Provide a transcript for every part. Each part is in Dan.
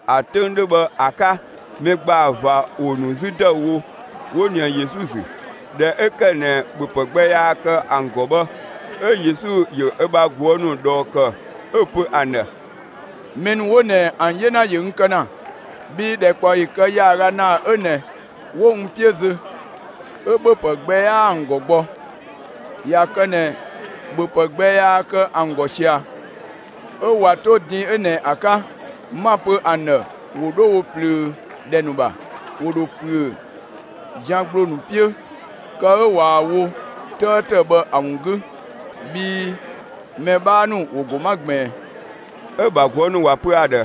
‑A 'töng 'dhö bhë ‑a 'ka, mɛ ‑gbaa ꞊va ‑wo ‑nu 'zü ‑dëüwo, 'wo ꞊nië Yesu ‑zü. ꞊Dhɛ 'ö ‑kë ꞊nɛ, ‑bhöpë gbɛ 'yaa kë ‑an ‑gɔ bhë, 'ö Yesu ‑yö ö ‑bha ꞊guë' ‑nu ꞊dhɔɔ ‑kë, 'ö‑ pö ‑an ‑dhë: «Mɛ ‑nu 'wo ꞊nɛ, ‑an 'yena ‑yö n kë ‑na, bhii ‑dhɛkpaɔyi kë ‑yaaga ‑naa 'ö ꞊nɛ, 'wo n 'piö zö, 'ö ‑bhöpë gbɛ 'yaa ‑an ‑gɔ gbɔ. ꞊Ya kë ꞊nɛ ‑bhöpë gbɛ yaa kë ‑an ‑gɔ ꞊sia, 'ö ꞊wa 'to din 'ö ꞊nɛ ‑a 'ka, 'ma‑ pö ‑an ‑dhë ‑wo 'dho wo ꞊plöö ‑dhɛ ‑nu ‑bha, ‑wo ‑dho ‑püö zian ‑gbloo ‑nu 'piö, kë 'ö ꞊waa‑ wo 'tëëtë bhë ‑a ‑wun 'gü, bhii mɛ 'bhaa ‑nu ‑wo ‑go 'ma ꞊gbiin.» 'Ö‑ ‑bha ꞊guë' ‑nu ‑wa pö ‑a ‑dhë: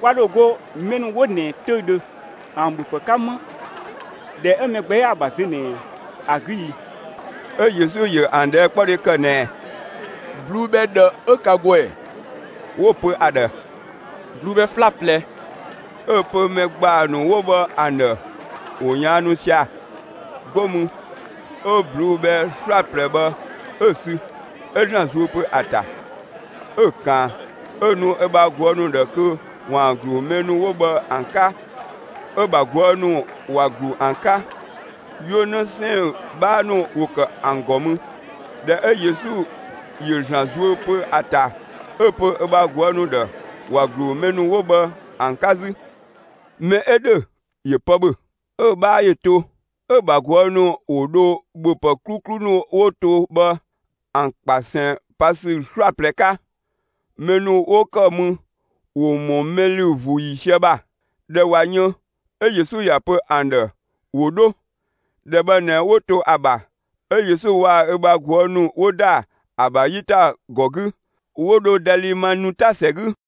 «Kwa ‑dho go mɛ ‑nu 'wo ꞊nɛ 'töüdhö ‑an ‑bhöpë 'ka 'më, ‑dhɛ 'ö mɛ gbɛ 'yaa‑ ‑bha zö ꞊nɛ ‑a 'gü i?» 'Ö Yesu ‑yö ‑an ꞊dhɛɛkpɔdhe ‑kë ꞊nɛɛ: «꞊Bluu'‑ bhɛ ꞊dhë 'ö ka ‑gɔ ‑ɛ?» 'Wo‑ pö ‑a ‑dhë: «꞊Bluu'‑ bhɛ 'slaplɛ.» 'Ö‑ pö mɛ ‑gbaa ‑nu 'wo bhë ‑an ‑dhë ‑wo ꞊yaannu sia‑. 'Go mü 'ö ꞊bluu'‑ bhɛ 'slaplɛ bhë 'ö‑ sü, 'ö ‑Zlan zuö pö ‑a ‑ta, 'ö‑ ꞊kaan, 'ö‑ nu ö ‑bha ꞊guë' ‑nu ‑dhë kö ‑waan ‑glu mɛ ‑nu 'wo bhë ‑an 'ka. 'Ö‑ ‑bha ꞊guë' ‑nu ‑wa ‑glu ‑an 'ka. 'Yuö‑ 'në 'sɛɛn‑ 'bhaa ‑nu ‑wo ‑kë ‑an ‑gɔ mü. ꞊Dhɛ 'ö Yesu ‑yö ‑Zlan zuö pö ‑a ‑ta, 'ö‑ pö ö bha ꞊guë' ‑nu ‑dhë, ‑wa ‑glu mɛ ‑nu 'wo bhë ‑an 'ka 'zü. Mɛ 'ö ‑dhö ‑yö pë ‑bhö, 'ö‑ 'bhaa ‑yö to, 'ö‑ ‑bha ꞊guë' ‑nu ‑wo dho ‑bhöpë 'kluklu ‑nu 'wo to bhë ‑an ꞊kpasɛn pa ‑sü 'slaplɛ 'ka. Mɛ ‑nu 'wo ‑kë mü ‑wo ‑mɔ mɛ ‑lü ‑vuu ‑yiisië ‑bha. ꞊Dhɛ ꞊wa yën 'ö Yesu ‑ya pö ‑an ‑dhë ‑wo 'dho. ‑Dhɛ bhë ꞊nɛ 'wo to ‑a ‑bha, 'ö Yesu waa‑ ö bha ꞊guë' ‑nu 'wo ‑da ‑a ‑bha 'yitagɔ 'gü, 'wo dho Dalimanuta ‑sɛ 'gü.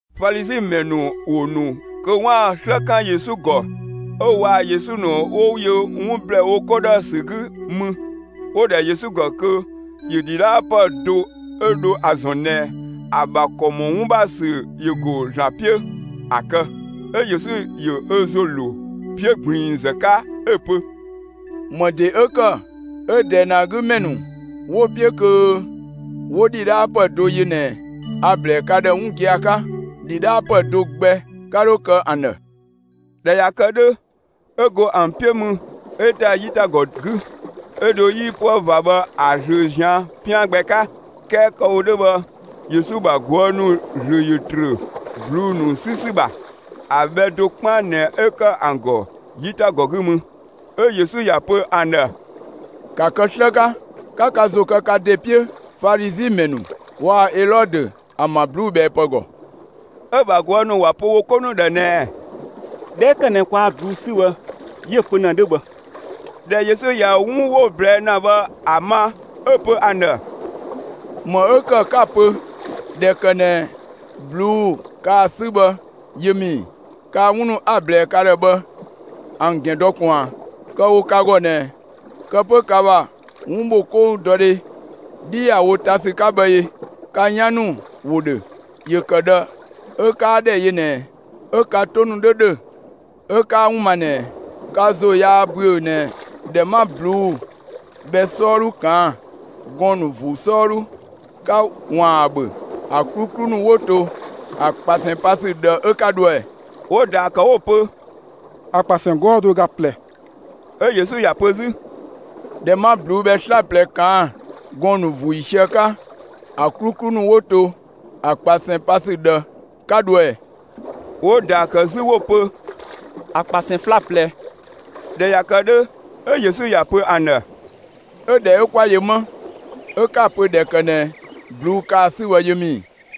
Falizi ‑mɛ ‑nu ‑wo ‑nu kö 'waan‑ 'slë 'kan Yesu ‑gɔ, 'ö waa‑ Yesu ‑nu 'wo yö 'wun ‑blɛɛ wo 'ko ‑dhë ‑sü 'gü mü, 'wo‑ ‑dhɛ Yesu ‑gɔ kö ‑yö ‑dhidhaapë do 'ö dho ‑a ‑zɔn ꞊nɛ ‑a ‑bha ‑kɔ ‑mɔ 'wun ‑bha ‑sü ‑yö ‑go ‑Zlan 'piö, ‑a kë. 'Ö Yesu ‑yö ö ‑zo ‑lo 'piö ꞊gbiinzë 'ka 'ö‑ pö: «‑Më ‑de 'ö ‑kë 'ö ꞊dɛɛ ꞊nɛ ‑a 'gü ‑mɛ ‑nu 'wo‑ 'piö kö 'wo ‑dhidhaapë do yö ꞊nɛ ꞊ɛ? A‑ ‑blɛɛ ka ‑dhë 'wun gia‑ 'ka: ‑Dhidhaapë do gbɛ 'ka 'dho kë ‑an ‑dhë!» ꞊Dhɛ ꞊ya kë 'dhö, 'ö go ‑an 'piö mü, 'ö ‑da 'yitagɔ 'gü, 'ö dho 'yipuë ꞊va bhë ‑a ꞊zlöö ꞊zian' 'pian gbɛ 'ka. 'Kɛɛ kë‑ wo 'dhö bhë, Yesu ‑bha ꞊guë' ‑nu ‑zlö ‑yö ‑trö ꞊bluu'‑ ‑nu 'sü ‑sü ‑bha. ‑A bhɛ do 'kpaan ꞊nɛ 'ö ‑kë ‑an ‑gɔ 'yitagɔ 'gü mü. 'Ö Yesu ‑ya pö ‑an ‑dhë: «‑Ka kë 'slë 'ka, 'ka ka ‑zo kë ka ‑de 'piö Falizi ‑mɛ ‑nu waa‑ Elɔdö ‑an ‑bha ꞊bluubhɛɛpë ‑gɔ!» 'Ö‑ ‑bha ꞊guë' ‑nu ‑wa pö wo 'ko ‑nu ‑dhë ꞊nɛɛ: «꞊Dhɛ 'ö ‑kë ꞊nɛ kwaa ꞊bluu'‑ 'sü bhë, 'yö‑ pö ‑na 'dhö bhë.» ꞊Dhɛ Yesu ꞊ya 'wun 'wo‑ ꞊blɛɛ' ‑na bhë ‑a ma, 'ö‑ pö ‑an ‑dhë: «‑Më 'ö ‑kë 'ka‑ pö ꞊dhɛ ‑kë ꞊nɛ ꞊bluu'‑ kaa‑ 'sü bhë, yö ‑mü ‑i? Kaa 'wun ‑nu 'a‑ ꞊blɛɛ ka ‑dhë bhë, ‑an ‑gɛn dɔ ꞊kun ꞊a? Kë‑ wo ka ‑gɔ ꞊nɛ, kë 'pö ka ‑bha 'wunbhokoudɔdhe 'dhi ‑ya wo ta ‑sü 'ka bhë ee? Ka 'yan ‑nu ‑wo ‑dhö; ‑yö ‑kë ꞊dhë 'ö 'kaa ‑dhɛ yö ꞊nɛɛ, 'ö ka 'to ‑nu 'dho ‑dhö, 'ö 'kaa 'wun ma ꞊nɛɛ? Ka ‑zo 'yaa ‑büö ꞊nɛ ꞊dhɛ 'ma ꞊bluu'‑ bhɛ 'sɔɔdhu ꞊kaan' gɔɔn‑ ‑nu ‑vuu 'sɔɔdhu 'ka ‑waan ‑an ‑bhö, ‑a 'kluklu ‑nu ‑wo to ‑a ꞊kpasɛn pa ‑sü ꞊dhë 'ö 'ka dhoë ꞊ɛ?» 'Wo‑ ‑daa ‑kë 'wo‑ pö: «‑A ꞊kpasɛn 'gɔɔ‑ do ö ga ꞊plɛ.» 'Ö Yesu ‑ya pö 'zü: «꞊Dhɛ 'ma ꞊bluu'‑ bhɛ 'slaplɛ ꞊kaan' gɔɔn‑ ‑nu ‑vuu ‑yiisië 'ka, ‑a 'kluklu ‑nu 'wo to ‑a ꞊kpasɛn pa ‑sü ꞊dhë 'ka dhoë ꞊ɛ?» 'Wo‑ ‑daa ‑kë 'zü 'wo‑ pö: «‑A ꞊kpasɛn 'slaplɛ.» ꞊Dhɛ ꞊ya kë 'dhö, 'ö Yesu ‑ya pö ‑an ‑dhë: «'Ö ꞊dhɛ 'ö 'kwa yö më 'ö 'ka‑ pö ꞊dhɛ ‑kë ꞊nɛ ꞊bluu'‑ kaa‑ 'sü bhë, yö ‑mü ‑i?»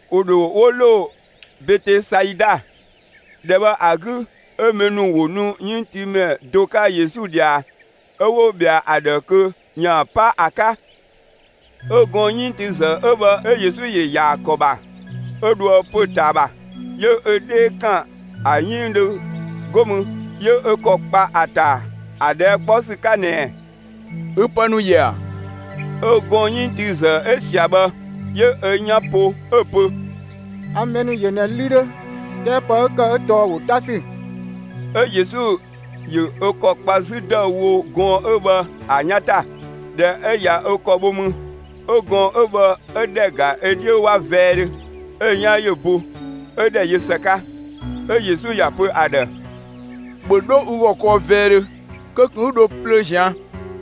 ‑Wo ‑dho 'wo ‑lo Betesaida. ‑Dhɛ bhë ‑a 'gü, 'ö mɛ ‑nu ‑wo nu 'yënngtiimɛ do 'ka Yesu ꞊dhia, 'ö 'wo ꞊bhɛa ‑a ‑dhë kö ‑yaan 'pa ‑a 'ka. 'Ö gɔɔn‑ 'yënngtiizë 'ö bhë 'ö Yesu ‑yö ‑yaa ‑kɔ ‑bha, 'ö dhoë pö‑ ꞊taa ‑bha. 'Yö ö 'dhee ‑kan ‑a 'yënngdhö, 'go mü 'yö ö ‑kɔ ‑kpa ‑a ‑ta ‑a ꞊dhɛɛ' 'kpɔ ‑sü 'ka ꞊nɛɛ: «Ü pë ‑nu ‑yö ‑a?» 'Ö gɔɔn‑ 'yënngtiizë 'ö ꞊sia bhë, 'yö ö 'yan po 'ö‑ pö: «A mɛ ‑nu ‑yö ꞊nɛ 'lü ‑nu 'dhö, 'kɛɛ pë 'ö ‑kë tɔɔ ‑wo 'ta ‑sü.» 'Ö Yesu ‑yö ö ‑kɔ kpa 'zü ‑dëüwo gɔɔn‑ 'ö bhë ‑a 'yan ‑ta. ꞊Dhɛ 'ö ꞊ya ö ‑kɔ bho mü, 'ö gɔɔn‑ 'ö bhë 'ö ‑dhɛ ‑ga ö 'dhiö 'wa vɛɛdhö, 'ö‑ 'yan ‑yö bo, 'ö ‑dhɛ yö ‑së 'ka. 'Ö Yesu ‑ya ‑pö ‑a ‑dhë: «‑Bhö 'dho ü ‑gɔ kɔɔ vɛɛdhö kö ꞊kun 'ü dho plöö ꞊zian'.»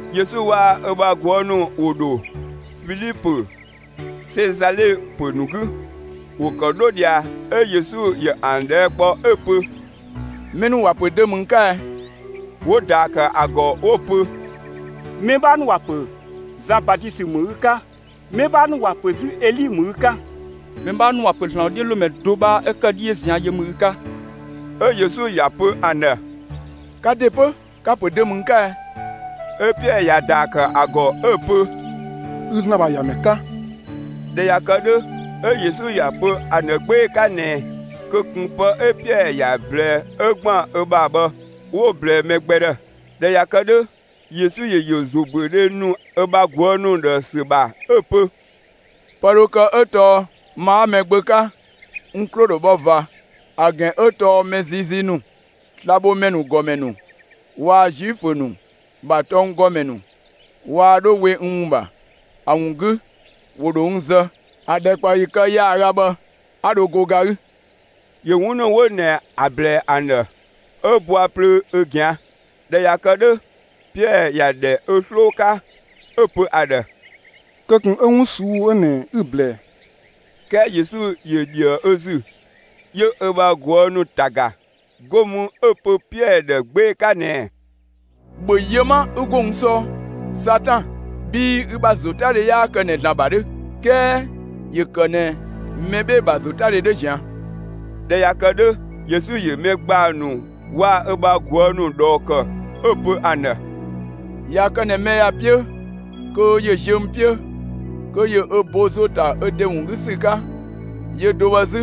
Yesu waa‑ ö bha ꞊guë' ‑nu ‑wo ‑dho Filipö Sezale ‑pö ‑nu 'gü. ‑Wo ‑kë 'dho ꞊dhia, 'ö Yesu ‑yö ‑an ꞊dhɛɛ' kpɔ 'ö‑ pö: «Mɛ ‑nu ‑wa ‑pö dö ‑mü n 'ka ɛ?» 'Wo‑ ‑daa ‑kë ‑a ‑gɔ 'wo‑ pö: «Mɛ 'bhaa ‑nu ‑wa pö Zan Batisö ‑mü ü 'ka, mɛ 'bhaa ‑nu ‑wa pö 'zü Eli ‑mü ü 'ka, mɛ 'bhaa ‑nu ‑wa pö ‑Zlan ‑wodhiölomɛ do 'bhaa 'ö ‑kë 'dhiö ꞊zian' ‑yö ‑mü ü 'ka.» 'Ö Yesu ‑ya pö ‑an ‑dhë: «Ka ‑de 'pö, ka‑ ‑pö dö ‑mü n 'ka ɛ?» 'Ö Piɛɛ ‑ya ‑daa ‑kë ‑a ‑gɔ 'ö‑ pö: «Ü ‑Zlan ‑bha ‑Yamɛ 'ka.» ꞊Dhɛ ꞊ya kë 'dhö, 'ö Yesu ‑ya pö ‑an ‑dhë 'gbee‑ 'ka ꞊nɛɛ kö ꞊kun pë 'ö Piɛɛ ‑ya ꞊blɛɛ 'ö ‑gban ö ‑bha bhë, 'wo‑ ꞊blɛɛ mɛ gbɛ ‑dhë. ꞊Dhɛ ꞊ya kë 'dhö, Yesu ‑yö ‑yö ‑zobüödhe ‑nu ö bha ꞊guë' ‑nu ‑dhë ‑sü ‑bha 'ö‑ pö: «Pë dho kë 'ö tɔɔ ma 'a Mɛgbö 'ka, n 'klo‑ ‑dho bhɔ ꞊va. ‑A ‑gɛn 'ö tɔɔ mɛ ziizii ‑nu, slabhomɛ ‑nu ‑gɔmɛ ‑nu waa‑ Zuifö ‑nu ‑bha tɔnggɔmɛ ‑nu waa 'dho we n ‑wun ‑bha. ‑A ‑wun 'gü, ‑wo ‑dho n zë. ‑A ‑dhɛkpaɔyi kë ‑yaaga bhë 'a dho go ga 'gü.» ‑Yö 'wun ‑nu 'wo ꞊nɛ ‑a ‑blɛɛ ‑an ‑dhë, 'ö bɔa plöö ö ꞊gɛan'. ꞊Dhɛ ꞊ya kë 'dhö, Piɛɛ ‑ya ‑dhɛ ö 'sloo 'ka, 'ö‑ pö ‑a ‑dhë: «Kö ꞊kun 'ö 'wun ꞊suu'‑ 'ö ꞊nɛ 'ü‑ ꞊blɛɛ!» 'Kɛɛ Yesu ‑yö ‑dhië ö ‑zü, 'yö ö bha ꞊guë' ‑nu ‑ta ‑ga, 'go mü 'ö‑ pö Piɛɛ ‑dhë 'gbee‑ 'ka ꞊nɛɛ: «‑Bhö yö 'ma 'ü 'go n 'sɔɔ, Satan, bhii ü ‑bha ‑zotadhe 'yaa kë ꞊nɛ ‑Zlan ‑bha 'dhö, 'kɛɛ ‑yö ‑kë ꞊nɛ mɛ 'bhee‑ ‑bha ‑zotadhe 'dhö ꞊zian'!» ꞊Dhɛ ꞊ya kë 'dhö, Yesu ‑yö mɛ ‑gbaa ‑nu waa‑ ö bha ꞊guë' ‑nu ꞊dhɔɔ ‑kë, 'ö‑ pö ‑an ‑dhë: «꞊Ya kë ꞊nɛ mɛ ‑ya 'piö kö ‑yö ziö n 'piö, kö ‑yö ö bo ‑zo ‑ta ö ‑de ‑wun 'gü ‑sü 'ka, yö do bhë 'zü,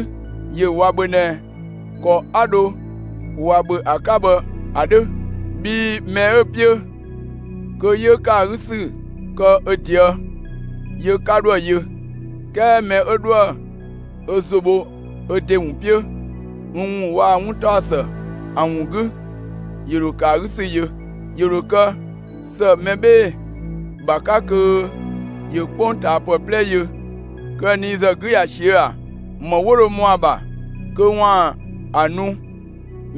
‑yö ꞊wa ‑bhö ꞊nɛ ‑kɔ 'a dho ꞊wa ‑bhö ‑a 'ka bhë ‑a 'dhö. Bhii mɛ 'ö‑ 'piö kö 'yö ‑kë ‑a 'gü ‑sü kë ö ꞊deë', yö 'ka 'dho ‑a yö, 'kɛɛ mɛ 'ö 'dhoë‑ ö ‑zo bho ö ‑de ‑wun 'piö n ‑wun waa‑ 'wuntaɔsë ‑an ‑wun 'gü, ‑yö ‑dho ‑kë ‑a 'gü ‑sü yö. ‑Yö ‑dho kë ‑së mɛ 'bhee‑ ‑bha 'ka kö ‑yö 'kpongtaapë 'plɛ yö, kö ‑a nii ‑zë 'gü ꞊ya ꞊siö'‑ ‑a? ‑Më 'wo dho ‑mɔ ‑a ‑bha kö ‑waan ‑a nu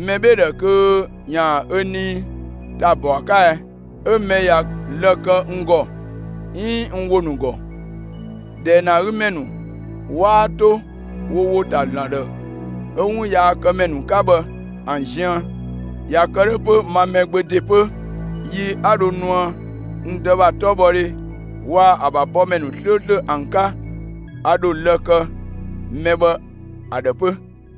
mɛ 'bhee‑ ‑dhë kö ‑yaan ö nii ‑ta bɔ ‑a 'ka ɛ? 'Ö mɛ ꞊ya lë‑ kë n ‑gɔ, 'iin n ‑wo ‑nu ‑gɔ, ꞊dɛɛ ꞊nɛ ‑a 'gü ‑mɛ ‑nu 'waa 'to wo ‑wo ‑ta ‑Zlan ‑dhë 'ö 'wo 'wun yaakëmɛ ‑nu 'ka bhë ‑an ziën, ꞊ya kë 'dhö 'pö, ma Mɛgbö ‑de 'pö, yi 'a dho nuë n Dë ‑bha 'tɔbhɔdhe, waa‑ ‑a ‑bha bɔmɛ ‑nu 'slööslö ‑an 'ka, a ‑dho lë‑ kë mɛ bhë ‑a ‑dhë 'pö.»